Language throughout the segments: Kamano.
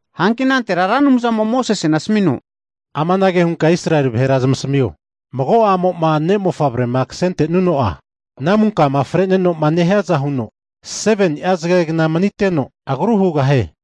Hanki anantera Ra Anumzamo'a Mosesena asamino, Amanage hunka Israeli vahera zamasamio, mago a'mo'ma ne' mofavre'ma kasentenuno'a, namunkama freneno'ma nehiaza huno 7ni'a zagegna maniteno agrua hugahie.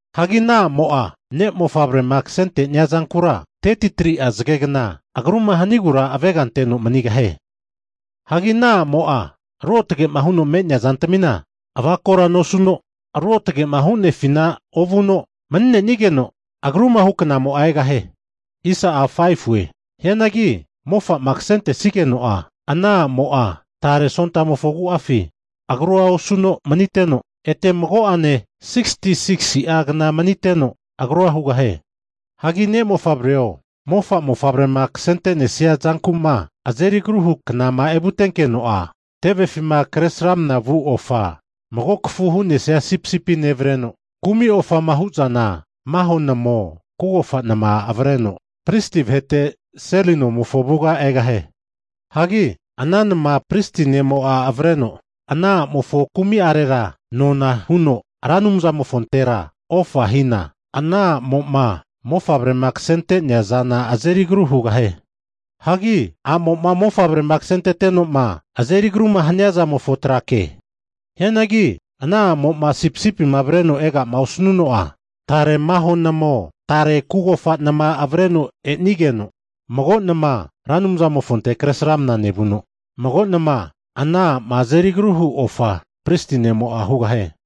Hagi ana a'mo'a ne' mofavrema kasente'nea zankura, 33'a zagegna agruma hanigura avega anteno manigahie. Hagi ana a'mo'a ruotage'ma huno me'neazantamina avakora nosuno, ruotagema hunefina ovuno mani'nenigeno agruma hu knamo'a egahie. Hianagi mofa'ma kasentesigeno'a ana a'mo'a tare sontamofo agu'afi agrua osuno maniteno, ete mago'ane 66'agna maniteno agrua hugahie. Hagi ne'mofavreo, mofa mofavre'ma kasente'nesia zanku'ma azeri agruma hu knama evutenkeno'a, tevefima kresramna vu ofa mago kafu hu'nesia sipisipi nevreno, kumi ofama hu'zana maho namao kugofa nama avreno pristi vahete seli nomofo avuga egahie. Hagi ana nama pristi ne'mo'a avreno, ana a'mo'ma agruma osu'nea zantera nona huno Ra Anumzamofontera ofa hina, ana a'mo'ma mofavrema kasenteteno azeri agru hugahie. Hagi ama'i a'mo'ma mofavrema kasentete'noma azeri agruma hania zamofo trake. Hianagi ana a'mo'ma sipisipima avrenoma ega'ma osanuno'a, tare maho namao, tare kugofa nama avreno e'nigeno, mago nama Ra Anumzamofonte kresramana nevuno, mago nama ana a'ma azeri agru hu ofa pristi ne'mo'a hugahie.